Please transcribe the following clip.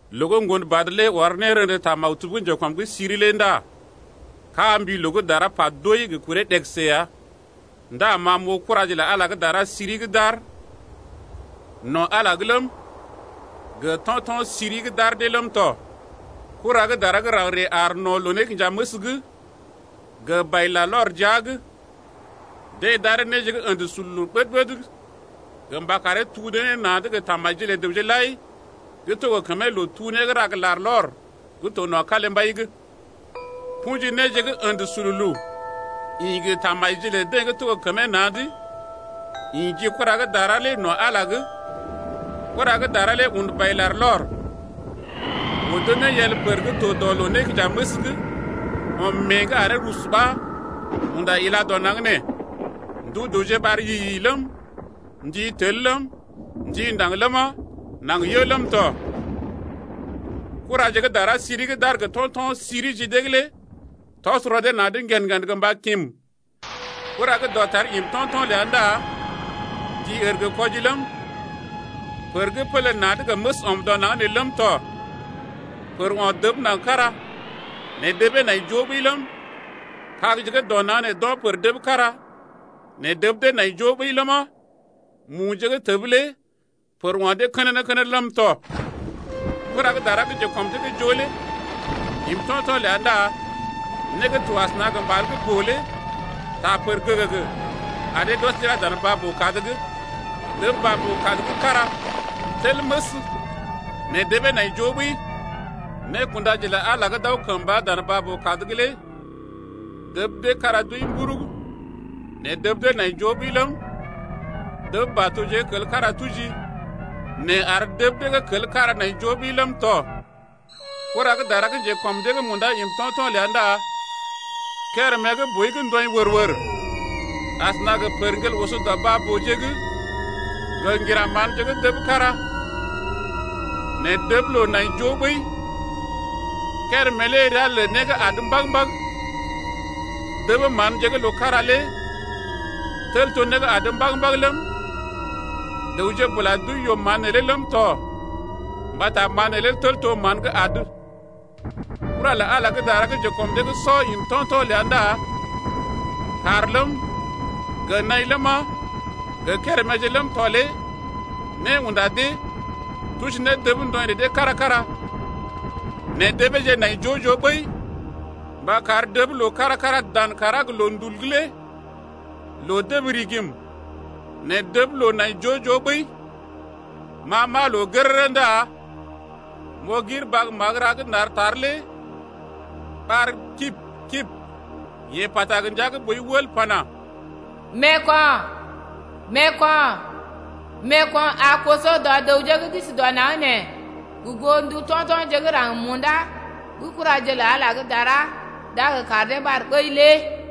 Loo gə́ Ŋgonbad lé ɔr nérḛdə ta maktub gə́ njekɔm’g siri lé ndá kaa mbi loo gə́ dara pa doi gə kuree ɗegəse ya. Ndá ma m’oo kuraje lə Ala gə́ dara siri gə́ d’aar no̰ Ala’g ləm, gə to̰to̰ siri gə́ d’ar dee ləm tɔ. Kura gə́ dara gə́ raŋg ree aar no̰ loo-nékinjaməs’g gə bai-larlɔr jia’g. Deḛ d’aree néje gə́ ə̰də sululu ɓəd-ɓəd gə mba karee tuu dee ne na̰’d gə tamajije lə dəwje lai gə́ to gə kəmee loo-tuu-né gə́ ra gə larlɔr gə́ to no̰ kalimbai’g. Kṵji néje gə́ ə̰də sululu ḭ gə tamajije lə dee gə́ to gə kəmee na̰’d, ḭ ji kura gə́ dara lé no̰ Ala’g. Kura gə́ dara lé un bai-larlɔr, odo ne yel pər gə́ to dɔ loo-nékinjaməs’g ɔm mée’g aree rusu ɓa unda ilá dɔ naŋg nee. Ndu dəwje ɓar yi-yi ləm, ndi tel ləm, ndi ndaŋg ləma, naŋg yə ləm tɔ. Kuraje gə́ dara siri gə́ d’aar gə to̰to̰je siri ji dee’g lé tɔs rɔ dee na̰’d ŋgen-ŋgen gə mba kim. Kura gə́ dɔtar im to̰to̰ ləa ndá ndi ər gə kwɔji ləm, pər gə́ pələ na̰’d gə məs ɔm dɔ naŋg nee ləm tɔ. Pər o̰ dəb naŋg kára nɛ debee nai joo ɓəi ləm, kagje gə́ dɔ naŋg nee d’o̰ pər dəb kára nɛ dəb dee nai joo ɓəi ləma, muje gə́ təb lé pər o̰ dee kənənə-kənənə ləm tɔ. Kura gə́ dara gə́ njekɔm dee’g joo lé im to̰to̰ ləa ndá né gə́ to asəna gə mbal gə́ boo lé taa pər gəgəgə ar dee d’ɔs d’ila dan baa-boo-kad’g, dəb baa-boo-kad gə́ kára tel məs nɛ debee nai joo ɓəi. Nékundaje lə Ala gə́ d’aw kəmba dan baa-boo-kad’g lé dəb dee kára d’wəi mburug nɛ dəb dee nai joo ɓəi ləm, dəb batoje gə́ kel kára tuji nɛ ar dəb dee gə́ kel kára nai joo ɓəi ləm tɔ. Kura gə́ dara gə́ njekɔm dee’g munda im to̰to̰ ləa ndá kérèmé gə́ boi gə́ ndɔḭ wər-wər asəna gə pərŋgel bèe oso dɔ baa-booje’g gə ŋgira manje gə́ dəb kára nɛ dəb loo nai joo ɓəi. Kérémé lé ria lə Né gə́ adə mbag-mbag. Dəb manje gə́ loo kára lé tel to gə́ né gə́ adə mbag-mbag ləm, dəwje bula d’wəi yoo-mán neelé ləm tɔ mbata mán neelé tel to gə́ mán gə́ adə. Kura lə Ala gə́ dara gə́ njekɔm dee’g sɔ im to̰to̰ ləa ndá kàr ləm, gə naḭ ləma, gə kéréméje ləm tɔ lé né unda dee, tuji ne dəb ndɔḭ lə dee kára-kára nɛ debeeje nai joo-joo ɓəi mba kar dəb loo kára-kára dan kàrá gə loondul’g lé loo dəb rigim nɛ dəb loo nai joo-joo ɓəi. Ma m’aa loo gərərə ndá m’oo gir bag magəra gə́ nar tar lé ɓar kib-kib, yee pata gə ndia gə́ boi wəl pana: Meeko̰, meeko̰, meeko̰ a koso dɔ dəwje gə́ d’isi dɔ naŋg nee gə goo ndu to̰to̰je gə́ raŋg munda gə́ kuraje lə Ala gə́ dara d’a gə kar dee ɓar ɓəi lé.